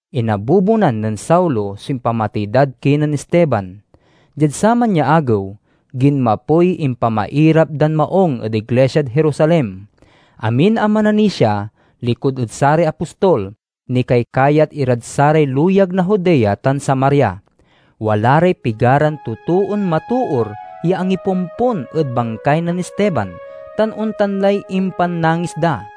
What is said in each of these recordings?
Inabubonan nen Saulo so impamatey dad kinen Esteban. Diad saman ya agew, ginmapoy impamairap dan maung ed iglisiad Jerusalem. Amin a mananisia, likud ed saray apostol, nikaykayat irad saray luyag na Judea tan Samaria. Wala ray pigaran totoon matoor ya angipompon ed bangkay nen Esteban, tan ontan lay impannangis da.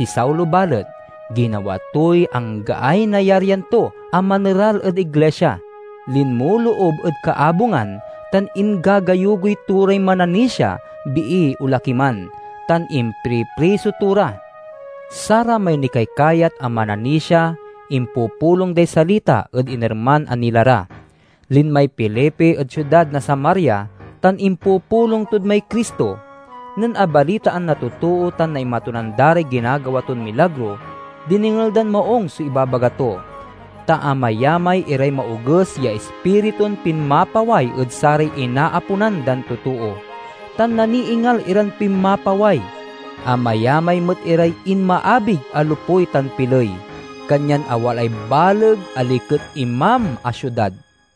Si Saulo, balet, ginawa toy anggaay nayaryan to a maneral ed iglisia. Linmoloob ed kaabungan tan ingagayugoy to ray mananisia, bii o laki man, tan impripriso to ra. Saramay nikaykayat a mananisia impupulong day salita ed inerman a nila ra. Linmay Felipe ed siudad na Samaria tan impupulong tod may Cristo. Nen abalitaan na totoo tan naimatunan da ray ginagawa ton milagro, dinengel dan maung so ibabaga to. Ta amayamay iray maoges ya ispiritun pinmapaway ed saray inaaponan dan totoo, tan naniingal iran pinmapaway. Amayamay met iray inmaabig a lopuy tan piley. Kanyan awalaay baleg a liket imam a siudad.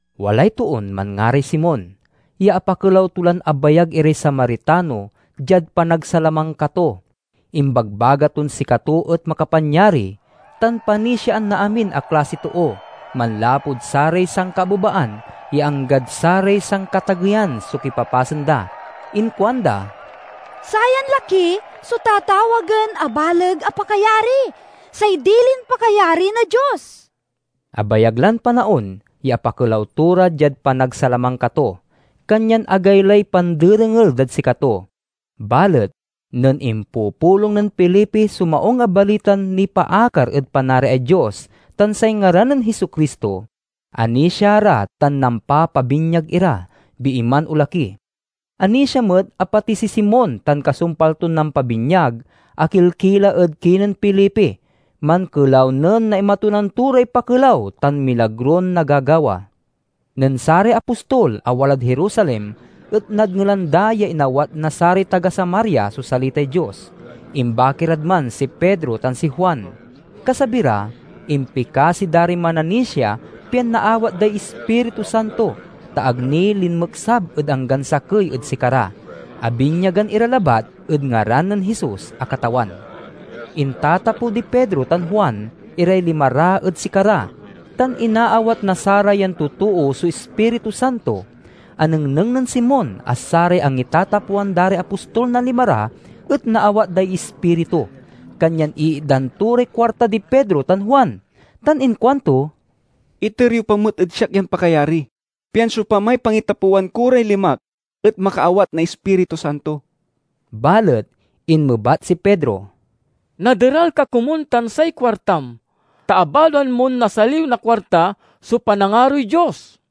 Walay toon manngaray Simon, ya apakelaw to lan abayag iray Samaritano diad panagsalamangka to. Imbagbaga ton sikato et makapanyari, tan panisiaan na amin a klasiy too, manlapud saray sankaabebaan ya anggad saray sankatageyan so kipapasen da. Inkuanda, "Sayan laki so tatawagen a Baleg a Pakayari, say dilin pakayari na Dios." Abayag lan panaon ya apakelaw to ra diad panagsalamangka to, kanyan agaylay panderengel dad sikato. Balet nen impupulong nen Felipe so Maung a Balitan nipaakar ed Panariay Dios tan say ngaran nen Jesu-Cristo, anisia ra tan nampapabinyag ira, bii man o laki. Anisia met a pati si Simon tan kasumpal ton nampabinyag, akilkila ed kinen Felipe. Mankelaw nen naimatunan to ray pakelaw tan milagron nagagawa. Nen saray apostol a walad Jerusalem et nadngelan da ya inawat na saray taga Samaria so salitay Dios, imbaki rad man si Pedro tan si Juan. Kasabi ra, impikasi da ray mananisia pian naawat day Ispiritu Santo, ta ag ni linmeksab ed anggan sakey ed sikara. Abinyagan ira labat ed ngaran nen Jesus a Katawan. Intatapew di Pedro tan Juan iray lima ra ed sikara, tan inaawat na sarayan totoo so Ispiritu Santo. Anengneng nen Simon a saray angitatapewan da ray apostol na lima ra et naawat day Ispiritu, kanyan iitdan to ray kuarta di Pedro tan Juan, tan inkuanto, "Iter yo pa met ed siak yan pakayari, pian siopamay pangitapewan ko ray limak et makaawat na Ispiritu Santo." Balet inmebat si Pedro, "Naderal ka komun tan say kuartam, ta abaloan mon nasaliw na kuarta so panangaroy Dios!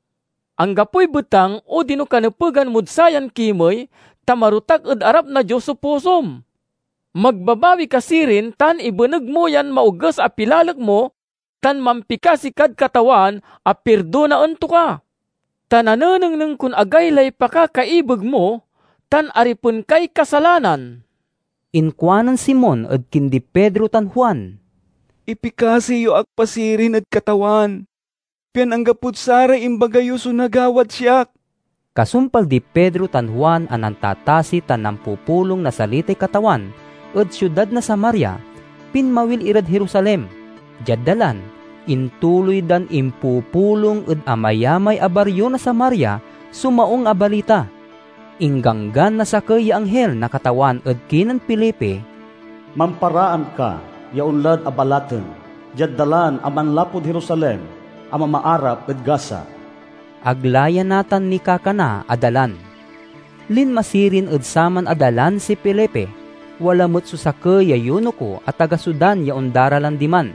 Anggapoy betang odino kanepegan mod sayan kimey, ta marotak ed arap na Dios so pusom. Magbabawi ka sirin tan ibeneg mo yan maoges a pilalek mo, tan mampikasi kad Katawan a pirdonaen to ka. Ta nanenengneng kon agaylay pakakaibeg mo, tan aripen kay kasalanan." Inkuanen Simon ed kindi Pedro tan Juan, "Ipikasi yo ak pa sirin ed Katawan, pian anggapod saray imbaga yo so nagawad siak." Kasumpal di Pedro tan Juan a nantatasi tan nampupulong na salitay Katawan ed siudad na Samaria, pinmawil irad Jerusalem. Diad dalan, intuloy dan impupulong ed amayamay a bario na Samaria so Maung a Balita. Ingganggan na sakey ya anghil na Katawan ed kinen Felipe, "Mamparaan ka ya onla ed abalaten, diad dalan a manlapud Jerusalem a mamaarap ed Gaza." (Ag la ya natan nikakana a dalan.) Linma sirin ed saman a dalan si Felipe. Wala met so sakey ya yunuko a taga Sudan ya ondaralan diman.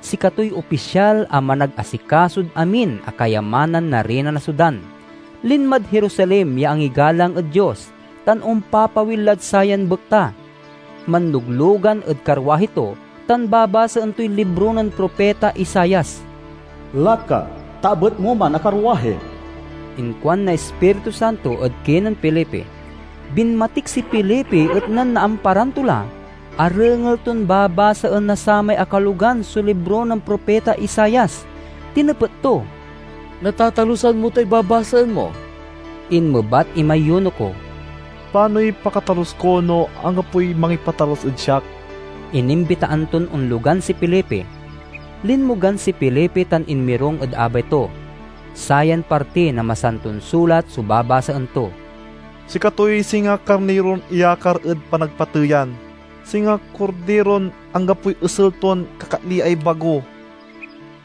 Sikatoy opisyal a managasikasod amin a kayamanan na Riyna na Sudan. Linmad Jerusalem ya angigalang ed Dios, tan ompapawil lad sayan bekta. Manloglogan ed karwahi to, tan babasaen toy libro nen propita Isaias. "Laka, ta abet mo man a karwahi," inkuan na Ispiritu Santo ed kinen Felipe. Binmatik si Felipe, et nen naamparan to la, arengel ton babasaen na samay akalogan so libro nen propita Isaias. Tinepet to, "Natatalusan mo tay babasaen mo?" Inmebat imay yunuko, "Panoy pakatalus ko no anggapoy mangipatalus ed siak?" Inimbitaan ton onlogan si Felipe. Linmogan si Felipe tan inmirung ed abay to. Sayan parti na Masanton Sulat so babasaen to: "Sikatoy singa karniron iyaakar ed panagpateyan; singa kordiron anggapoy esel ton kakatliay bago;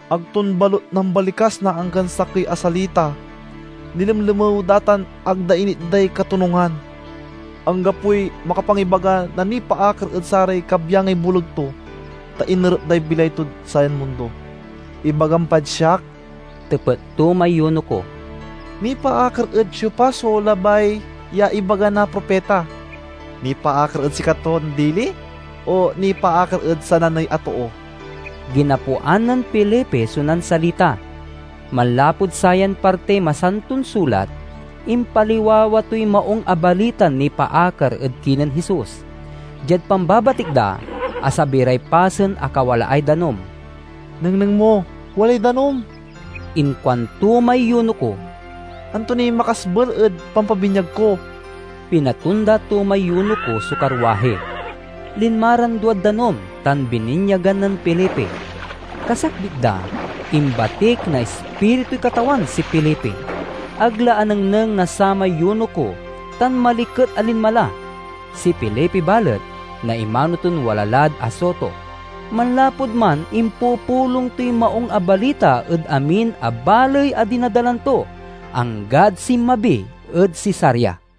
ag ton balut nambalikas na anggan sakey a salita. Nilemlemew da tan ag da initday katonungan. Anggapoy makapangibaga na nipaakar ed saray kabyangay boleg to, ta inerep day bilay tod sayan mundo." "Ibagam pad siak," tepet to may yunuko, "nipaakar ed siopa so labay ya ibaga na propita? Nipaakar ed sikaton dili o nipaakar ed sananey a too?" Ginapuan nen Felipe so nansalita; manlapud sayan partiy Masanton Sulat, impaliwawa toy Maung a Balitan nipaakar ed kinen Jesus. Diad pambabatik da, asabi ray pasen a kawalaay danum. "Nengneng mo, walay danum!" inkuanto may yunuko. "Anto niy makasbel ed pampabinyag ko?" Pinatonda to may yunuko so karwahi. Linma ran duad danum, tan bininyagan nen Felipe. Kasakbit da, imbatik na Ispirituy Katawan si Felipe. Ag la anengneng na samay yunuko, tan maliket a linma la. Si Felipe, balet, naimano ton wala lad Azoto. Manlapud man impupulong toy Maung a Balita ed amin a baley a dinadalan to, anggad sinmabi ed Cesarea.